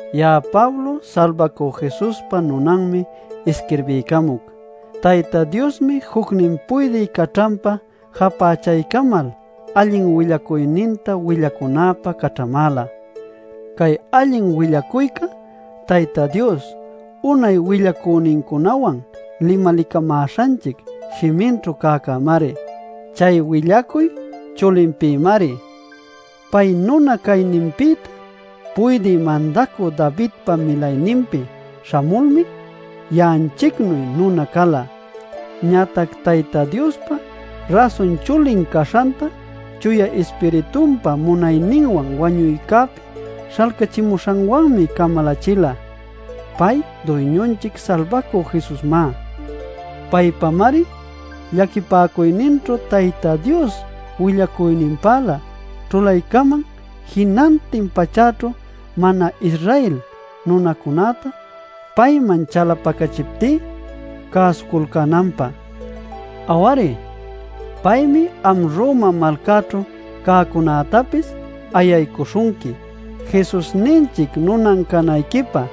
Ya'a Pablo Salbacü Jesuspa nunanmi isquirbiycamuc. Tayta Diosmi jucnin puydï caćhanpä japächaycamal allin willacuyninta willacunäpä caćhamäla. Cay allin willacuyca Tayta Dios unay willacünincunawan limalicamäśhanchic shiminćhu cäyäcämari. Chay willacuy Chulinpïmari. Pay nuna cayninpïtá puydï mandacü Davidpa milayninpi śhamulmi ya'anchicnuy nuna cala. Ñatac Tayta Diospa Rasun Chulin caśhantá Chuya Ispiritunpa munayninwan wañuycäpi śhalcachimuśhanwanmi camalachila. Pay Duyñunchic Salbacü Jesusmá. Paypamari llaquipäcuyninćhu Tayta Dios willacüninpälä ćhulaycaman jinantin pachäćhu mana-Israel nunacunäta payman chalapacachiptí cäsuculcänanpä. Aw-ari, paymi am Roma malcaćhu cäcunätapis ayaycuśhunqui Jesusninchicpa nunan capäcunayquipä.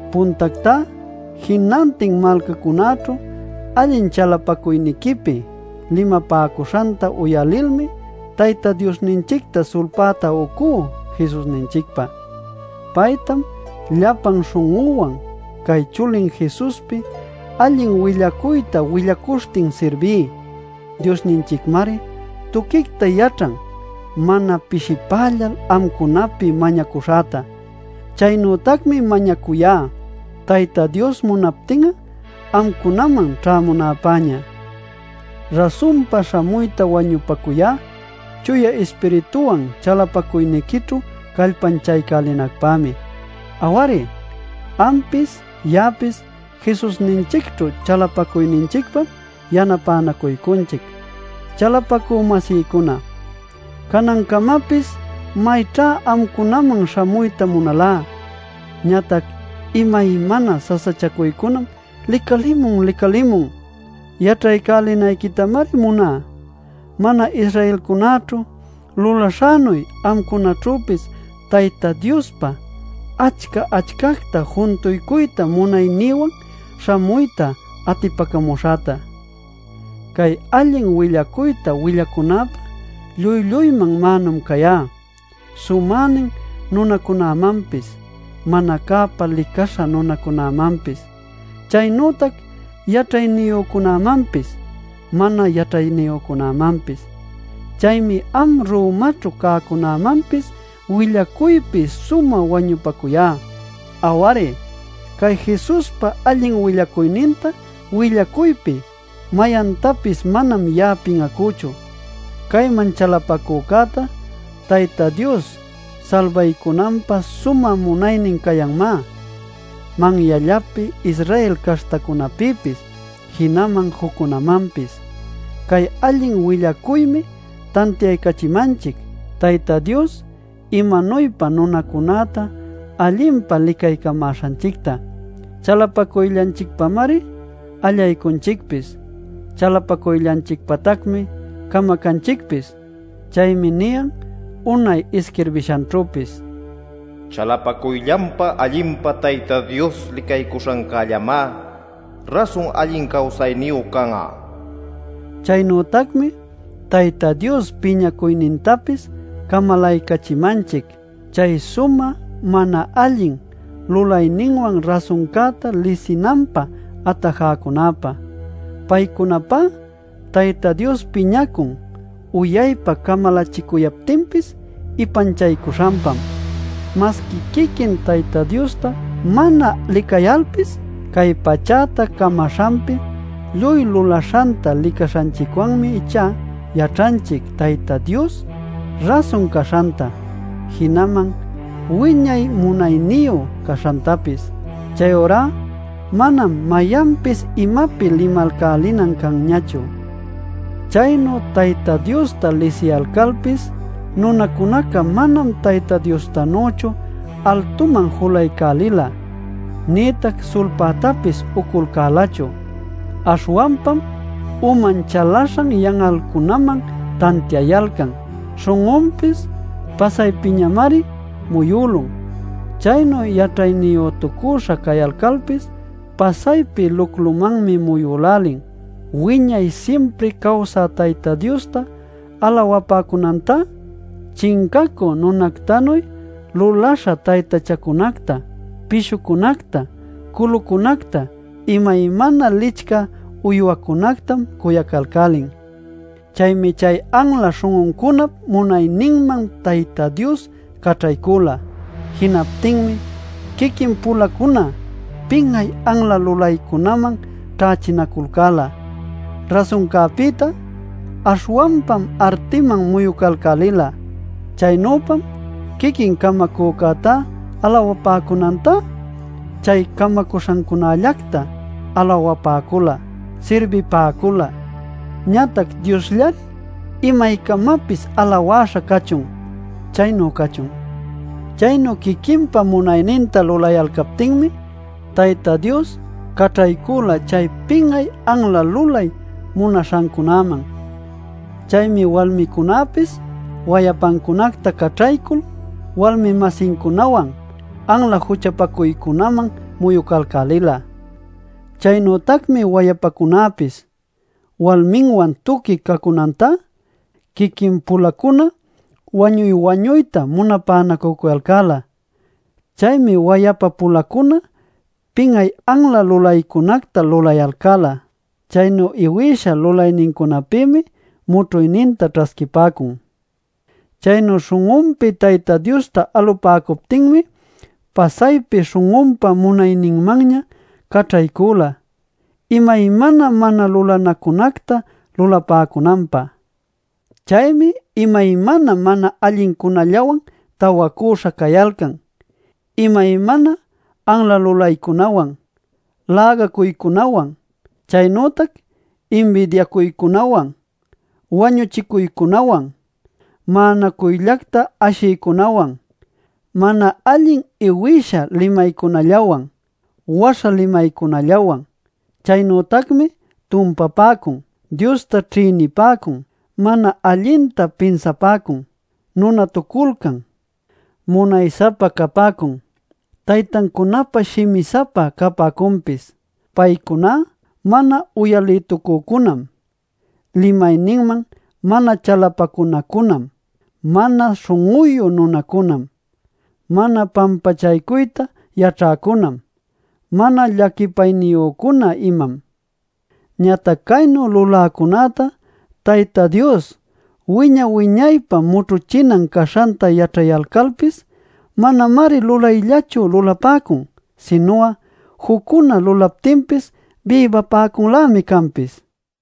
Puntactá, jinantin malcacunäćhu allin chalapacuyniquipi limapäcuśhanta uyalilmi Tayta Diosninchicta sulpäta ucú Jesusninchicpa. Paytam llapan śhun'üwan cay Chulin Jesuspi allin willacuyta willacuśhtin sirbí. Diosninchicmari tuquicta yaćhan mana pishipällal amcunapi mañacuśhäta. Chaynütacmi mañacuyá, Tayta Dios munaptin'a amcunaman ćhämunäpäña. Rasunpa śhamuyta wañupacuyá Chuya Ispirituwan chalapacuyniquićhu callpanchaycälinacpämi. Aw-ari, ampis ya'apis Jesusninchicćhu chalapacuyninchicpam yanapänacuycunchic. Chalapacü-masïcuna, canancamapis mayćha amcunaman śhamuyta munalá. Ñatac imaymana sasachacuycunam licalicämun licalicämun. Yaćhaycälinayquitamari muná mana-Israelcunäćhu lulaśhänuy amcunaćhüpis Tayta Diospä achca-achcacta juntuycuyta munaynïwan śhamuyta atipacamuśhäta. Cay allin willacuyta willacunäpä lluy-lluyman mänum cayá: sumänin nunacunämanpis, mana cäpä licaśha nunacunämanpis, chaynütac yaćhayniyücunämanpis mana yaćhayniyücunämanpis. Chaymi am Romaćhu cäcunämanpis willaycuypi sumä wañupacuyá. Aw-ari, cay Jesuspa allin willacuyninta willacuypi mayantapis manam ya'a pin'acüchu. Cayman chalapacücäta Tayta Dios salbaycunanpä sumä munaynin cayanmá, manyallapi Israel caśhtacunapïpis jinaman juccunamanpis. Cay allin willacuymi tantiaycachimanchic, Tayta Dios imanuypa nunacunäta allinpa licaycamäśhanchicta: chalapacuyllanchicpamari allaycunchicpis, chalapacuyllanchicpatacmi camacanchicpis. Chaymi niyan unay isquirbishanćhüpis: “Chalapacuyllanpa allinpa Tayta Dios licaycuśhancällamá rasun allin cawsayniyu can'a” nil. Chaynütacmi Tayta Dios piñacuynintapis camalaycachimanchic chay sumä mana allin lulayninwan rasuncäta lisinanpä atajäcunäpä. Paycunapá Tayta Dios piñacun uyaypa camalaycachicuptinpis ipanchapäcuśhanpam. Masqui quiquin Tayta Diosta mana licayalpis, cay pachäta camaśhanpi lluy lulaśhanta licaśhanchicwanmi ichá yaćhanchic Tayta Dios rasun caśhanta, jinaman wiñay munayniyu caśhantapis. Chayurá manam mayanpis imapi limalcälinan canñachu. Chaynu Tayta Diosta lisiyalcalpis nunacunaca manam Tayta Diostanüchu altuman julaycälila nïtac sulpätapis uculcälachu. Aśhwanpam uman chalaśhan yan'alcunaman tantiayalcan, śhun'unpis pasaypimanñamari muyülun. Chaynu yaćhayniyütucüśha cayalcalpis pasaypi luclumanmi muyülälin. Wiñay simpri cawsä Tayta Diosta alawapäcunantá, chincacü nunactanuy luläśha taytachacunacta, pishucunacta, culucunacta, imaymana licchä uywacunactam cuyacalcälin. Chaymi chay anla śhun'uncunap munayninman Tayta Dios caćhaycüla. Jinaptinmi quiquin-pulacuna pin'ay anla lulaycunaman ćhächinaculcäla. Rasuncäpïtá aśhwanpam artiman muyucalcälila. Chaynüpam quiquin Camacücäta alawapäcunantá chay camaśhancunällacta alawapäcula, sirbipäcula. ¡Ñatac Diosllari imaycamapis alawäśha cachun! ¡Chaynu cachun! Chaynu quiquinpa munayninta lulayalcaptinmi, Tayta Dios caćhaycüla chay pin'ay anla lulay munaśhancunäman. Chaymi walmicunäpis wayapancunacta caćhaycul walmi-masincunawan anla juchapacuycunaman muyucalcälila. Chaynütacmi wayapacunäpis, walminwan tuqui cacunantá, quiquin-pulacuna wañuy-wañuyta munapanacücuyalcäla. Chaymi wayapa-pulacuna pin'ay anla lulaycunacta lulayalcäla. Caynu iwïsha lulaynincunapïmi mućhuyninta ćhasquipäcun. Chaynu śhun'unpi Tayta Diosta alupäcuptinmi pasaypi śhun'unpä munayninmanña caćhaycüla imaymana mana lulanacunacta lulapäcunanpä. Chaymi imaymana mana allincunallawan tawacüśha cayalcan: imaymana anla lulaycunawan, lägacuycunawan. Chaynütac inbidiacuycunawan, wañuchicuycunawan, ma'anacuyllacta ashiycunawan, mana allin iwïsha limaycunallawan, waśha limaycunallawan. Chaynütacmi tumpapäcun, Diosta ćhïnipäcun, mana allinta pinsapäcun, nunatuculcan, munay-sapa capäcun, taytancunapä shimi-sapa capäcunpis. Paycuná mana uyalïtucücunam, limayninman mana chalapacunacunam, mana śhun'uyu nunacunam, mana pampachaycuyta yaćhäcunam, mana llaquipayniyücuna imam. Ñatac caynu luläcunäta Tayta Dios wiña-wiñaypä mućhuchinan caśhanta yaćhayalcalpis manamari lulayllachu lulapäcun, sinu'a juccuna lulaptinpis bïbapäcunlämi canpis.